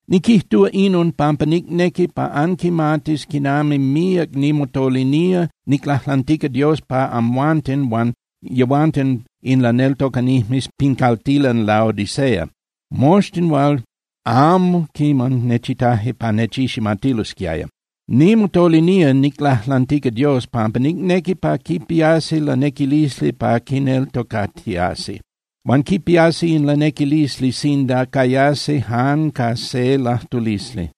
Niquijtúa inon pampa nicnequi pa anquimatis quinami míac nimotolinía niclajlantica Dios pa amhuanten huan yehuanten in laneltocanijmes pin caltilan Laodicea, moxtin hual amo quiman nechitaje pa nechiximatilosquiaya. Nimotolinía niclajlantica Dios pampa nicnequi pa quipiasi lanequilisli pa quineltocatiasi. Huan quipiasi in lanequilisli sinda cayasi ca jan se lajtulisli.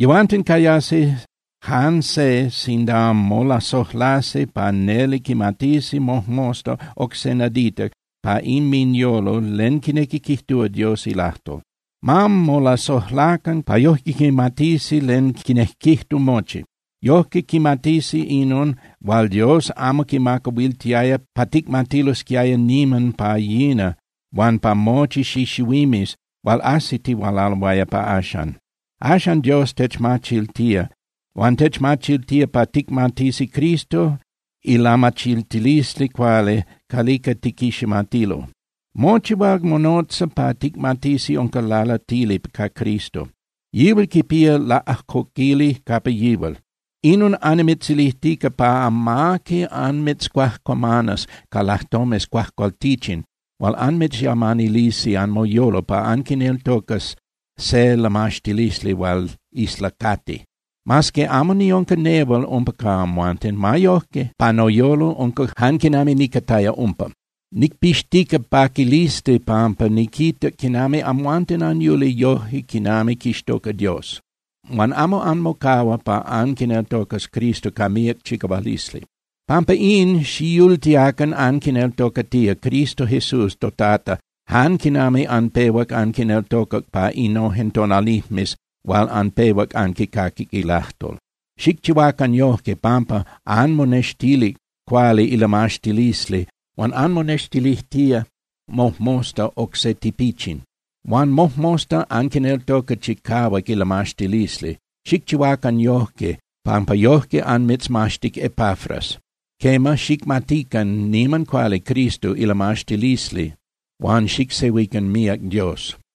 Yehuanten cayasi jan se sinda molasojlasi pa neli quimatisi mojmosta oc se nadita pa inminyolo len quinequi quijtúa Dios ilajtol. Ma molasojlacan pa yoje quimatisi len quinejquijtu mochi. Yojque quimatisi inon hual Dios amo quimacahuiltiaya pa ticmatilosquiaya niman pa yina huan pa mochi xixihuimes hual ajsitihualaloaya pa axan. Axan Dios techmachiltía. Huan techmachiltía pa ticmatisi Cristo ilamachiltilisli cuali calica tiquiximatilo. Mochi hual monotza pa ticmatisi unca lalatili ca Cristo. Yihual quipía laꞌajcoquili capa yihual. Inon annimitzilijtica pa amaqui anmitzcuajcuamanas ca lajtomes cuajcualtichin hual anmitzyamanilisi anmoyolo pa anquineltocas se lamaxtilisli hual islacati. Mas que amo niunca nehual umpa ca amhuanten, ma yoje pa noyolo unca jan quinami nicataya umpa. Nicpixtica paquilisli pampa niquita quinami amhuanten anyuli yoje quinami quixtoca Dios. Huan amo anmocahua pa anquineltocas Cristo ca míac chicahualisli. Pampa in, xiyultiacan anquineltocatía Cristo Jesús toTata jan quinami anpehuac anquineltocac pa innojen tonalijmes hual anpehuac anquicaquic ilajtol. Xicchihuacan yoje, pampa anmonextilic cuali ilamaxtilisli huan anmonextilijtía mojmosta oc se tipichin. Huan mojmosta anquineltoca chicahuac ilamaxtilisli. Xicchihuacan yojque pampa yojque anmitzmaxtic Epafras. Quema, xicmatican niman cuali Cristo ilamaxtilisli huan xicsehuican míac Dios.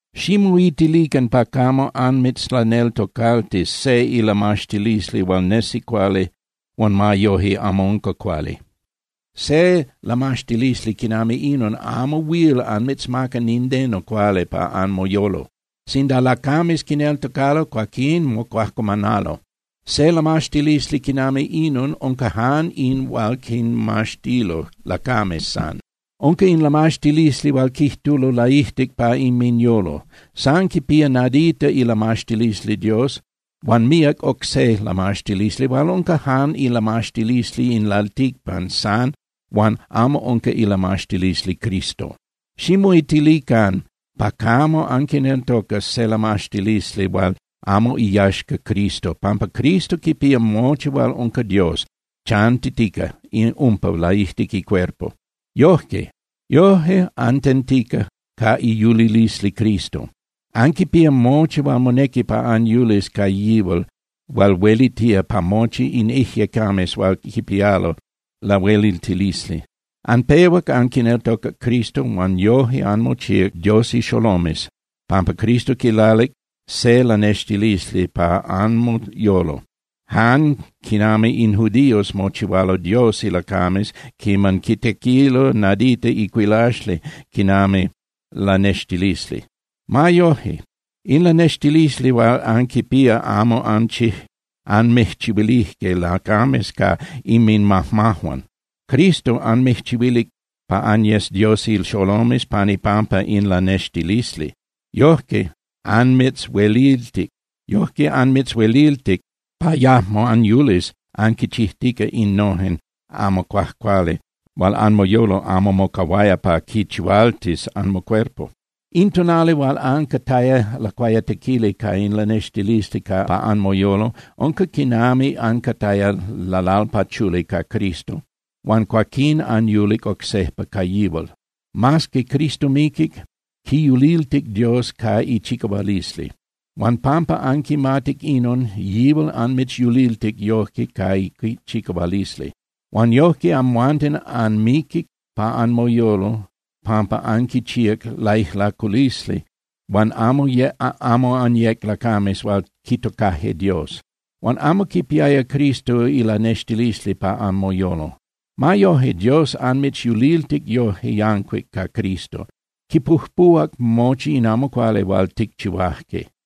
Ximoitilican pa camo anmitzlaneltocaltis se ilamaxtilisli hual nesi cuali huan ma yoje amo unca cuali. Se lamaxtilisli quinami inon amo huil anmitzmaca nindeno cuali pa anmoyolo. Sinda lacames quineltocalo, cuaquín mocuajcuamanalo. Se lamaxtilisli quinami inon unca jan in hual quimaxtilo lacames san. Unca in lamaxtilisli hual quijtulo laijtic pa inminyolo. San quipía nadita ilamaxtilisli Dios huan míac oc se lamaxtilisli hual unca jan ilamaxtilisli in lalticpan san huan amo unca ilamaxtilisli Cristo. Ximoitilican pa camo anquineltocas se lamaxtilisli hual amo iyaxca Cristo, pampa Cristo quipía mochi hual unca Dios chantitica umpa laijtic icuerpo. Yoje, antentica ca iyulilisli Cristo. Anquipía mochi hual monequi pa anyulis ca yihual hual huelitía pa mochi in ijyecames hual quipialo lahueliltilisli. Anpehuac anquineltocac Cristo huan yoje anmochíac Dios ixolomes pampa Cristo quilalic se lanextilisli pa anmoyolo, jan quinami in judíos mochihualo Dios ilacames quiman quitequilo nadita icuilaxli quinami lanextilisli. Ma yoje, in lanextilisli hual anquipía amo anmijchihuilije lacames ca inminmajmajuan. Cristo anmijchihuilic pa anyes Dios ixolomes pan ipampa in lanextilisli. Yojque anmitzhueliltic pa yajmo anyulis anquichijtica innojen amo cuajcuali hual anmoyolo amo mocahuaya pa quichihualtis anmocuerpo. In tonali hual ancataya lacuayatequili ca in lanextilisli pa anmoyolo unca quinami ancataya lalalpachuli ca Cristo huan cuaquín anyulic oc sejpa ca yihual. Mas que Cristo miquic, quiyuliltic Dios ca ichicahualisli. Huan pampa anquimatic inon, yihual anmitzyuliltic yoje ca ichicahualisli. Huan yojque amhuanten anmiquic pa anmoyolo pampa anquichíac laijlaculisli huan amo anyec lacames hual quitocaje Dios. Amo anquipiaya Cristo ilanextilisli pa anmoyolo. Ma yoje, Dios anmitzyuliltic yoje yancuic ca Cristo, quipujpuhuac mochi in amo cuali hual ticchihuaje.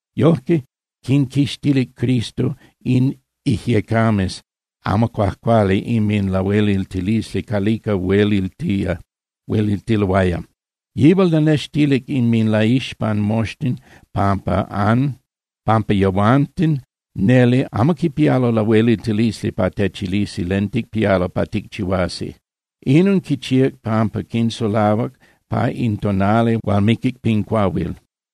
Yojque quinquixtilic Cristo in ijyecames amo cuajcuali inminlahueliltilisli calica huelitiloaya. Yihual lanextilic inminlaixpan moxtin pampa yehuanten neli amo quipialo lahueliltilisli pa techilisi len ticpialo pa ticchihuasi. Inon quichíac pampa quinsulahuac pa in tonali hual miquic pin cuahuil.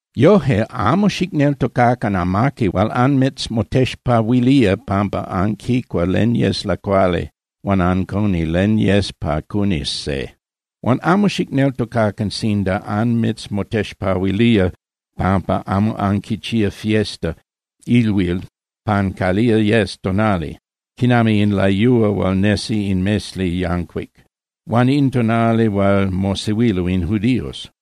Yoje, amo xicneltocacan amaqui hual anmitzmotexpahuilía pampa anquicua len yes lacuali huan ancuni len yes pa cunis se. Huan amo xicneltocacan sinda anmitzmotexpahuilía pampa amo anquichía fiesta (ilhuil) pan calía yes tonali, quinami in layúa hual nesi in mesli yancuic, huan in tonali hual mosehuilo in judíos.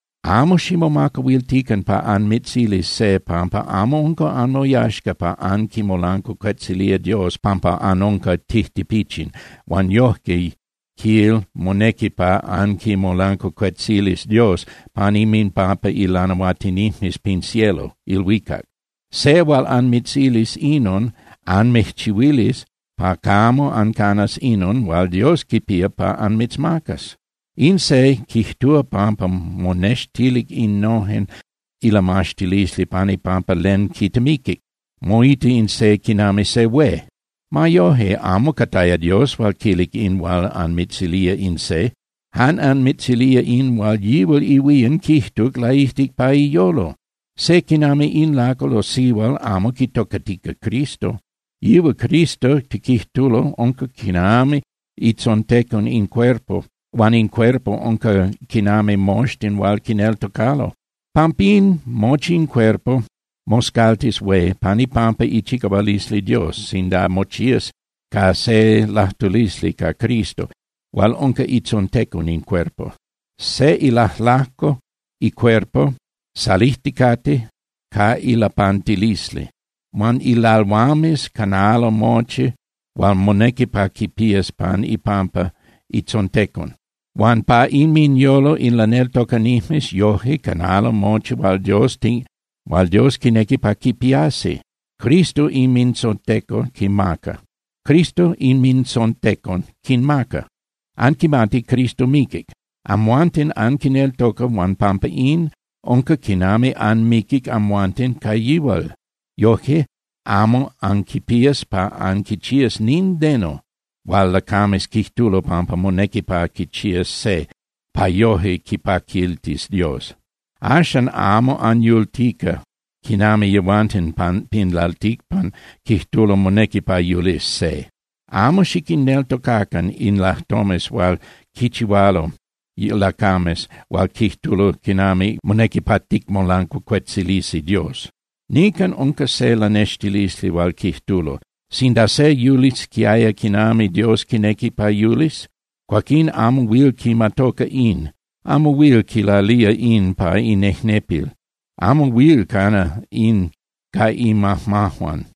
Amo ximomacahuiltican pa anmitzilis se pampa amo unca anmoyaxca pa anquimolancuacuetzilía Dios pampa anunca tijtipichin, huan yojque, quil, monequi pa anquimolancuacuetzilis Dios pan inminpampa ilanahuatinijmes pin cielo (ilhuicac). Se hual anmitzilis inon anmijchihuilis pa camo ancanas inon hual Dios quipía pa anmitzmacas. In se quijtúa pampa monextilic innojen ilamaxtilisli pan ipampa len quitemiquic, moita in se quinami se hué. Ma yoje, amo cataya Dios hual quilic in hual anmitzilía in se. Jan anmitzilía in hual yihual ihuían quijtuc laijtic pa iyolo. Se quinami in lacal o sihual amo quitocatica Cristo. Yihual Cristo tiquijtulo unca quinami itzontecon in cuerpo huan in cuerpo unca quinami moxtin hual quineltocalo. Pampín mochi in cuerpo moscaltis hué pan ipampa ichicahualisli Dios sinda mochías ca se lajtulisli ca Cristo hual unca itzontecon in cuerpo. Se ilajlajco icuerpo salijticate ca ilapantilisli. Huan ilalhuames canalo mochi hual monequi pa quipías pan ipampa itzontecon. Huan pa inminyolo in laneltocanijmes yoje canalo mochi hual Dios quinequi pa quipiasi. Cristo inmintzontecon quinmaca. Axan anquimati Cristo miquic. Amhuanten anquineltoca, huan pampa in, unca quinami anmiquic amhuanten ca yihual. Yoje, amo anquipías pa anquichías nindeno hual lacames quijtulo pampa monequi pa quichías se pa yoje quipaquiltis Dios. Axan amo anyultica quinami yehuanten pin lalticpan quijtulo monequi pa yulis se. Amo xiquinneltocacan in lajtomes hual quichihualo lacames hual quijtulo quinami monequi pa ticmolancuacuetzilisi Dios. Nican unca se lanextilisli hual quijtulo: “Sinda se yulisquiaya quinami Dios quinequi pa yulis, cuaquín amo huil quimatoca in, amo huil quilalía in pa inejnepil, amo huil cana in ca imajmajuan.”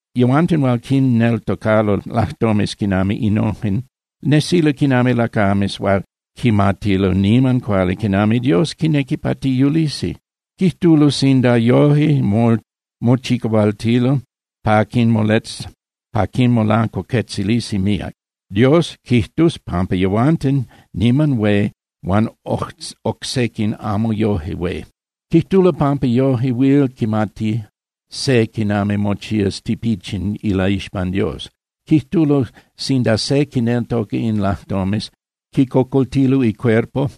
Yehuanten hual quinneltocalo lajtomes quinami innojen nesilo quinami lacames hual quimatilo niman cuali quinami Dios quinequi pa tiyulisi. Quijtulo sinda yoje mochihualtilo pa quimolancuacuetzilisi míac, Dios quijtus pampa yehuanten niman hué huan oc sequin amo yoje hué. Quijtulo pampa yoje huil quimati se quinami mochías tipichin ilaixpan Dios. Quijtulo sinda se quinneltoca in lajtomes, quicocoltilo icuerpo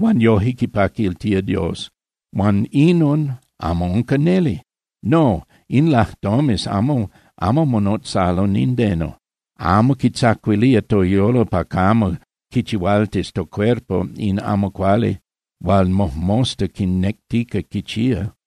huan yoje quipaquiltía Dios, huan inon amo unca neli. No, in lajtomes amo monotzalo nindeno, amo quitzacuilía toyolo pa camo quichihualtis tocuerpo in amo cuali hual mojmosta quinectica quichía.